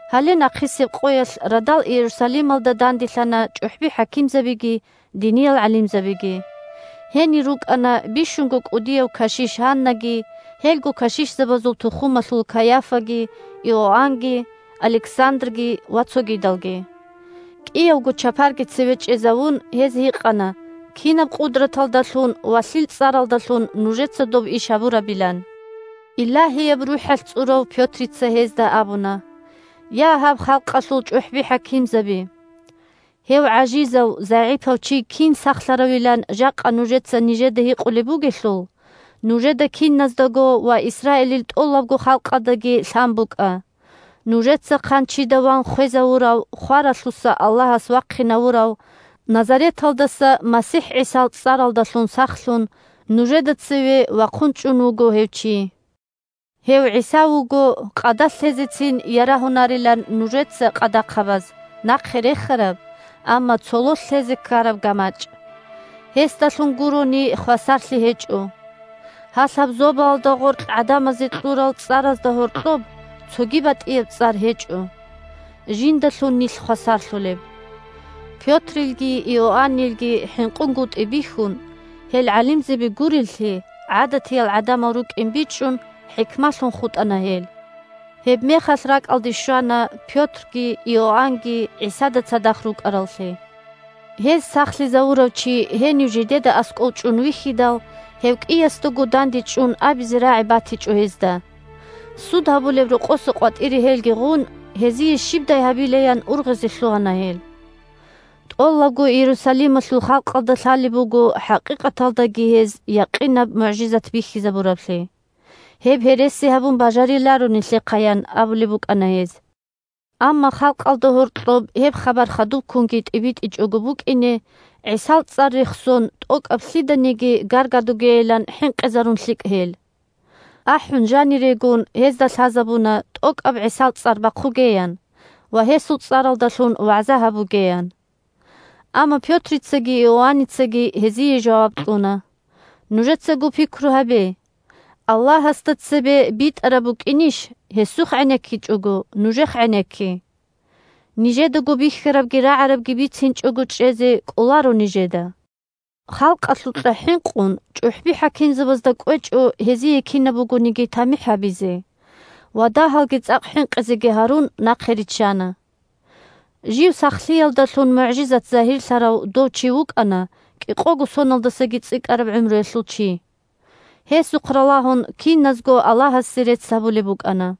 Гьале нахъисеб къоялъ радал Иерусалималда данделъана чӀухӀби-хӀакимзабиги диниял гӀалимзабиги. Гьенир рукӀана бищунго кӀудияв кашиш Гьаннаги, гьелго кашишзабазул тухумалъул Кайафаги, Иоаннги, Александрги ва цогидалги. КӀиявго чапарги цеве чӀезавун, гьез гьикъана кинаб къудраталдалъун ва лъил цӀаралдалъун нужеца доб иш гьабурабилан. Илагьияб РухӀалъ цӀурав Пётрица гьезда абуна: – Я, гьаб халкъалъул чӀухӀби-хӀакимзаби! Гьев гӀажизав-загӀипав чи кин сахлъаравилан жакъа нужеца нижеда гьикъулеб бугелъул, нужеда киназдаго ва Исраилил тӀолабго халкъалдаги лъан букӀа: нужеца хъанчида ван хвезавурав, хваралъуса Аллагьас вахъинавурав Назареталдаса МасихӀ ГӀисал цӀаралдалъун сахлъун нужеда цеве вахъун чӀун вуго гьев чи. Гьев ГӀиса вуго къадалъ лъезецин ярагьунарилан нужеца – къадахъабаз – нахъе рехараб, амма цололъ лъезе ккараб гамачӀ. Гьесдалъун гурони хвасарлъи гьечӀо. Гьалъаб зобалда гъоркь гӀадамазе кьурал цӀаразда гьоркьоб цоги батӀияб цӀар гьечӀо, жиндалъун нилъ хвасарлъулеб. Пётрилги Иоаннилги хӀинкъунгутӀи бихьун, гьел гӀалимзаби гуреллъи, гӀадатиял гӀадамал рукӀин бичӀчӀун хӀикмалъун хутӀана гьел. Гьебмехалъ ракӀалде щвана Пётрги Иоаннги ГӀисада цадахъ рукӀараллъи. Гьез сахлъизавурав чи гьенив жидеда аскӀов чӀун вихьидал, гьев кӀиясдаго дандечӀун абизе рагӀи батичӀо гьезда. Суд гьабулеб рокъоса къватӀире гьелги гъун, гьезие щибдай гьабилаян ургъизе лъугьана гьел. «ТӀолабго Иерусалималъул халкъалда лъалеб буго хӀакъикъаталдаги гьез якъинаб мугӀжизат бихьизабураблъи. Гьеб гьереси гьабун бажариларо нилъехъа, – ян абулеб букӀана гьез. – Амма халкъалда гьоркьоб гьеб хабар хадубккунги тӀибитӀичӀого букӀине ГӀисал цӀар рехсон тӀокӀаб лъиданиги гаргадугейилан хӀинкъизарун лъикӀ гьел». АхӀун жанирегун, гьезда лъазабуна тӀокӀаб ГӀисал цӀар бахъугеян ва гьесул цӀаралдалъун вагӀза гьабугеян. Амма Пётрицаги Иоанницаги гьезие жаваб кьуна: – Нужецаго пикру гьабе: Аллагьасда цебе битӀараб букӀинищ, гьесухъ гӀенеккичӀого, нужехъ гӀенекки? Нижедаго бихьарабги рагӀарабги бицинчӀого чӀезе кӀоларо нижеда. Халкъалъукьа хӀинкъун чӀухӀби-хӀакимзабазда кӀвечӀо гьезие кинаб бугониги тамихӀ гьабизе ва, дагьалги цӀакъ хӀинкъизеги гьарун, нахъе риччана. Жив сахлъиялдалъун мугӀжизат загьирлъарав дов чи вукӀана кӀикъого соналдасаги цӀикӀкӀараб гӀумруялъул чи. Гьесухъ ралагьун киназго Аллагьасе рецц гьабулеб букӀана.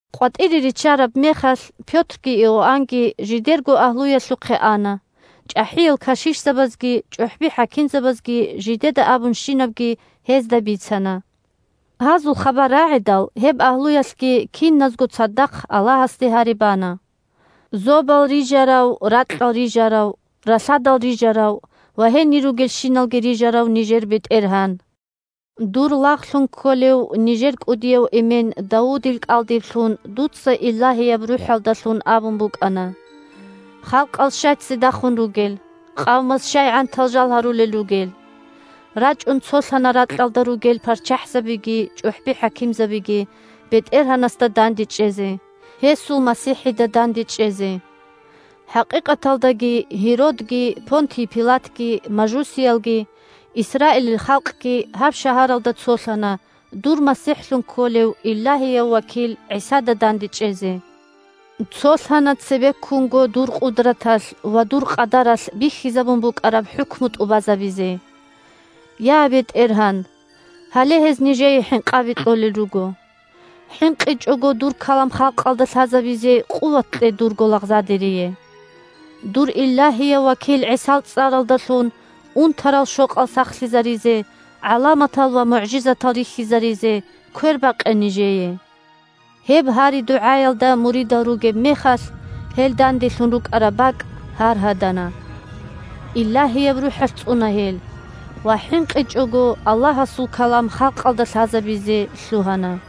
КъватӀире риччараб мехалъ Пётрги Иоаннги жидерго агьлуялъухъе ана; чӀахӀиял кашишзабазги чӀухӀби-хӀакимзабазги жидеда абунщинабги гьезда бицана. Гьазул хабар рагӀидал гьеб агьлуялъ киназго цадахъ Аллагьасде гьари бана: – Зобал рижарав, ракьал рижарав, ралъадал рижарав ва гьенир ругелщиналги рижарав нижер БетӀергьан! Дур лагълъун кколев нижер кӀудияв эмен Давудил кӀалдиб лъун дуца Илагьияб РухӀалдалъун абун букӀана: «Халкъал щай ццидахун ругел, Къавмаз щай гӀантал жал гьарулел ругел? РачӀун цолъана ракьалда ругел парччахӀзабиги ЧӀухӀби-хӀакимзабиги БетӀергьанасда дандечӀезе, Гьесул МасихӀида дандечӀезе». ХӀакъикъаталдаги Гьеродги, Понтий Пилатги, мажусиялги, Исраилил халкъги гьаб шагьаралда цолъана дур МасихӀлъун кколев илагьияв вакил ГӀисада дандечӀезе. Цолъана цебеккунго дур къудраталъ ва дур къадаралъ бихьизабун букӀараб хӀукму тӀубазабизе. Я, БетӀергьан! Гьале гьез нижее хӀинкъаби кьолел руго. ХӀинкъичӀого дур калам халкъалда лъазабизе къуват кье дурго лагъзадерие. Дур илагьияв вакил ГӀисал цӀаралдалъун унтарал-щокъал сахлъизаризе, гӀаламатал ва мугӀжизатал рихьизаризе квербакъе нижее! Гьеб гьари-дугӀаялда муридал ругеб мехалъ гьел данделъун рукӀараб бакӀ гьаргьадана, Илагьияб РухӀалъ цӀуна гьел ва хӀинкъичӀого Аллагьасул калам халкъалда лъазабизе лъугьана.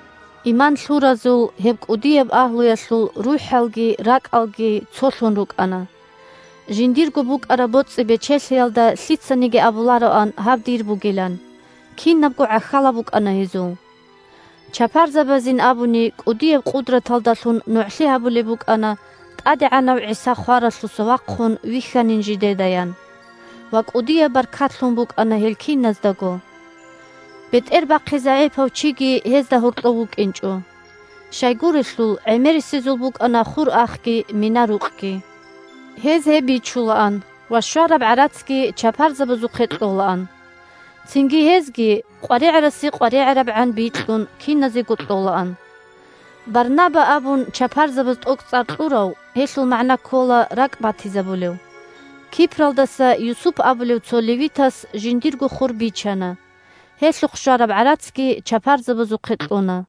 Иман лъуразул гьеб кӀудияб агьлуялъул рухӀалги ракӀалги цолъун рукӀана. Жиндирго букӀараб боцӀи-бечелъиялда лъицаниги абулароан гьаб дир бугилан, кинабго гӀахьалаб букӀана гьезул. Чапарзабазин абуни, кӀудияб къудраталдалъун нугӀлъи гьабулеб букӀана ТӀадегӀанав ГӀиса хваралъуса вахъун вихьанин жидедаян. Ва кӀудияб баркат лъун букӀана гьел киназдаго. БетӀербахъи загӀипав чиги гьезда гьоркьов вукӀинчӀо. Щайгурелъул гӀемерисезул букӀана хур-ахги, мина-рукъги. Гьез гьеб бичулаан ва щвараб гӀарацги чапарзабазухъе кьолаан. Цинги гьезги, къваригӀарасе къваригӀарабгӀан бикьун, киназего кьолаан. Барнаба абун чапарзабаз тӀокӀцӀар кьурав (гьелъул магӀна ккола «РакӀбатизабулев») Кипралдаса Юсуп абулев цо левитас жиндирго хур бичана, гьелъухъ щвараб гӀарацги чапарзабазухъе кьуна.